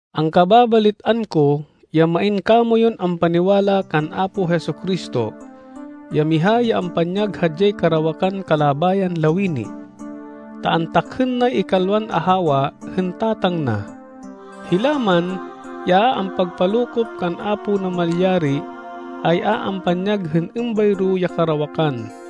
Angkababalit-an ko ya main kamoyun ampaniwala kan Apo Jesu-Cristo, ya miha ya ampanyag hadyay karawakan kalabayan lawini, ta antakhên nay ikalwan ahawa hên tatang na. Hila man ya a ampagpalokop kan Apo Namalyari, ay a ampanyag hên êmbayro ya karawakan.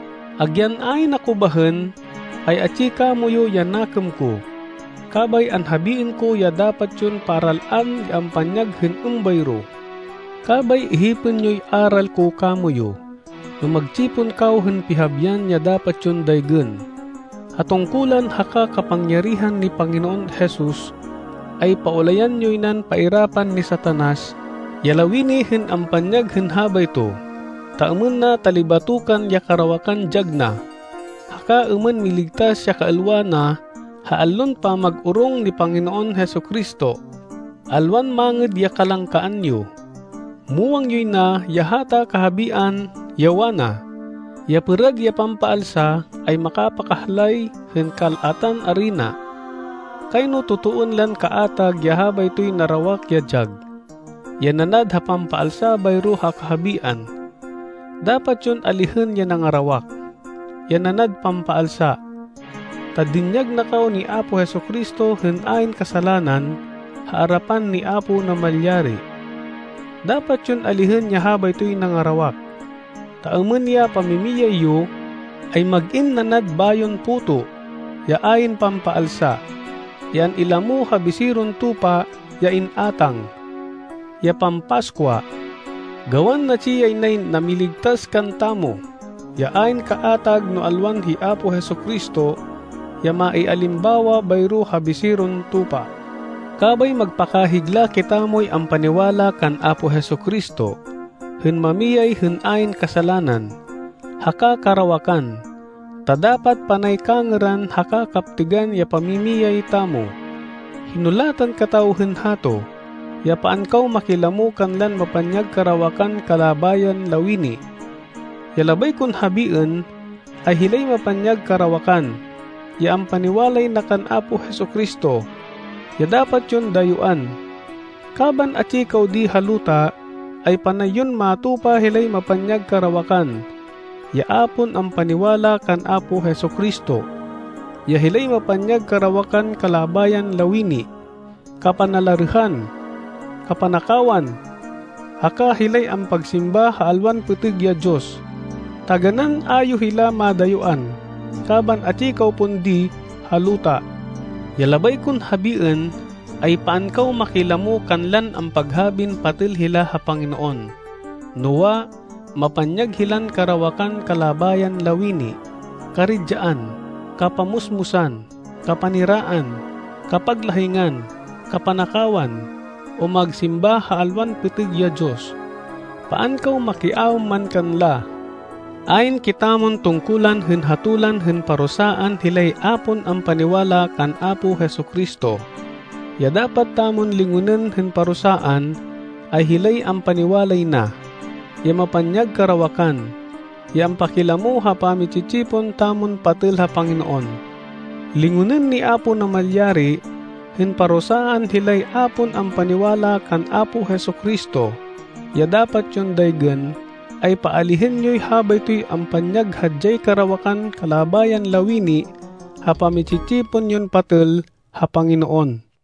Agyan ayn ako bahên, ay atsi kamoyu ya nakêm ko, kabay anhabiên ko ya dapat yon paral-an ya ampanyag hên êmbayro. Kabay ihipên yoy aral ko kamoyu, no magtsipon kaw hên pihabian ya dapat yon daygên. Ha tungkulan haka kapangyarihan ni Panginoon Jesus, ay paulayan yoy nan pairapan ni Satanas ya lawini hên ampanyag hên habayto, ta êmên na talibatokan ya karawakan dyag na, haka êmên miligtas ya kaêlwa na ha allon pamag-orong ni Panginoon Jesu-Cristo. Alwan mangêd ya kalangkaan yo. Muwang yoy na ya hata kahabian, ya wana, “Ya pêrad ya pampaalsa ay makapakahlay hên kal-atan arina.” Kayno totoên lan kaatag ya habaytoy narawak ya dyag, ya nanad ha pampaalsa bayro ha kahabian. Dapat yon alihên ya nangarawak, ya nanad pampaalsa, ta dinyag na kaw ni Apo Jesu-Cristo hên ayn kasalanan ha arapan ni Apo Namalyari. Dapat yon alihên ya habaytoy nangarawak, ta êmên ya pamimiyay yo, ay mag-in nanad bayon puto, ya ayn pampaalsa, ya an-ilamo ha biseron tupa ya in-átang, ya pampaskwa. Gawan natsi yay nay namiligtas kantamo, ya ayn kaatag no alwan hi Apo Jesu-Cristo, ya maialimbawa bayro ha biseron tupa. Kabay magpakahigla kitamoy ampaniwala kan Apo Jesu-Cristo, hên mamiyay hên ayn kasalanan, haka karawakan, ta dapat panay kangêran haka kaptêgan ya pamimiyay tamo. Hinulatan kataw hên hato, ya paan kaw makilamo kanlan mapanyag karawakan kalabayan lawini. Ya labay kon habiên, ay hilay mapanyag karawakan, ya ampaniwalay na kan Apo Jesu-Cristo, ya dapat yon dayuán. Kaban atsi kaw di ha luta, ay panay yon matupa hilay mapanyag karawakan, ya a pon ampaniwala kan Apo Jesu-Cristo, ya hilay mapanyag karawakan kalabayan lawini, kapanalarêhan, kapanakawan, haka hilay ampagsimba ha alwan pêtêg ya diyos. Taganán a yo hila madayuán kaban atsi kaw pon di ha luta. Ya labay kon habiên, ay paan kaw makilamo kanlan ampaghabin patêl hila ha Panginoon, noa, mapanyag hilan karawakan kalabayan lawini, karidyaan, kapamusmusan, kapaniraan, kapaglahingan, kapanakawan, o magsimba ha alwan pêtêg ya diyos. Paan kaw makiaêm man kanla. Ayn kitamon tungkulan hên hatolan hên parusaan hilay a pon ampaniwala kan Apo Jesu-Cristo. Ya dapat tamon lingonên hên parusaan, ay hilay ampaniwalay na, ya mapanyag karawakan, ya ampakilamo ha pami-tsi-tsipon tamon patêl ha Panginoon. Lingonên ni Apo Namalyari hên parusaan hilay a pon ampaniwala kan Apo Jesu-Cristo. Ya dapat yon daygên, ay paalihên yoy habaytoy ampanyag hadyay karawakan kalabayan lawini ha pami-tsi-tsipon yon patêl ha Panginoon.